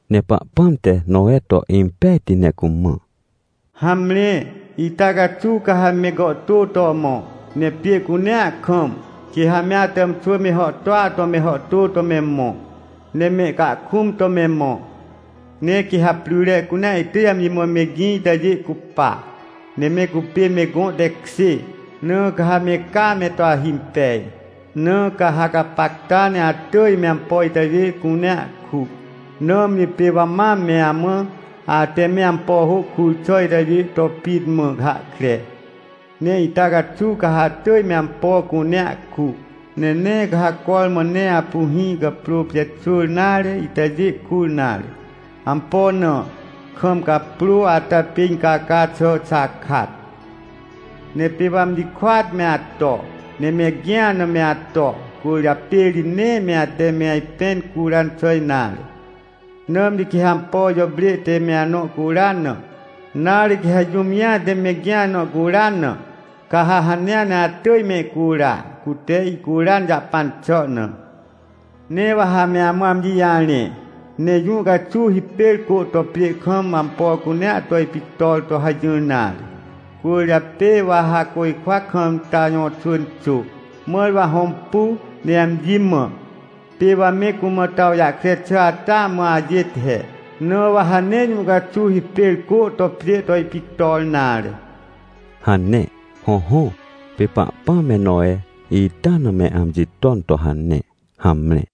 Ne Pahpãm te Nowe to impejti ne cumã: — Hamre, ita caxuw ca ha me gàhtô to mõ, ne pjê cunea kam, quê ha me atàmxwỳ me hàhtôa to me hàhtô to me mõ, ne mehcahkũm to me mõ. Ne quê ha pryre cunea ihtỳj amji mã megĩ itajê cupa, ne me cupê me gõ tekjê, na ca ha me caa me to ahimpej. Na ca ha gapacta ne atỳj me ampo itajê cunea ku. Nãmri pê wa mam me amã, ate me ampo hô kur xà itajê to pit mã hahkre. Ne ita caxuw ca ha atỳj me ampo cunea ku. — Ne nee ca ha cormã ne apu hĩ caprô pijaxwỳr nare itajê kur nare. Ampo na? Kam caprô ata pê incaca xà xakat. — Ne pê wa amji kôat me ato, ne megĩa na me ato, cwỳrjapê ri nee me ate me ajpẽn curan xà nare. Nãmri quê ha ampo jàprê te me anõ curan na, nare quê ha jũm jĩa te megĩa nõ curan na, ca ha hanea ne atỳj mehcura, cute ihcuran jahpan xà na. — Ne wa ha me amã amji jarẽ, ne jũ caxuw hipêr cô to pjê kam ampo cunea to ipictor to hajỹr nare. Cwỳrjapê wa ha côjkwa kam ta jõxwỳn xô, mãr wa hõmpu, ne amji mã: — “Pê wa me cumã to awjahkre xà ata mã ajêt he. Na wa ha nee jũ caxuw hipêr cô to pjê to ipictor nare” — hane. Hõhõ, pê Pahpãm me Nowe, ita na me amji ton to hane. Hamre.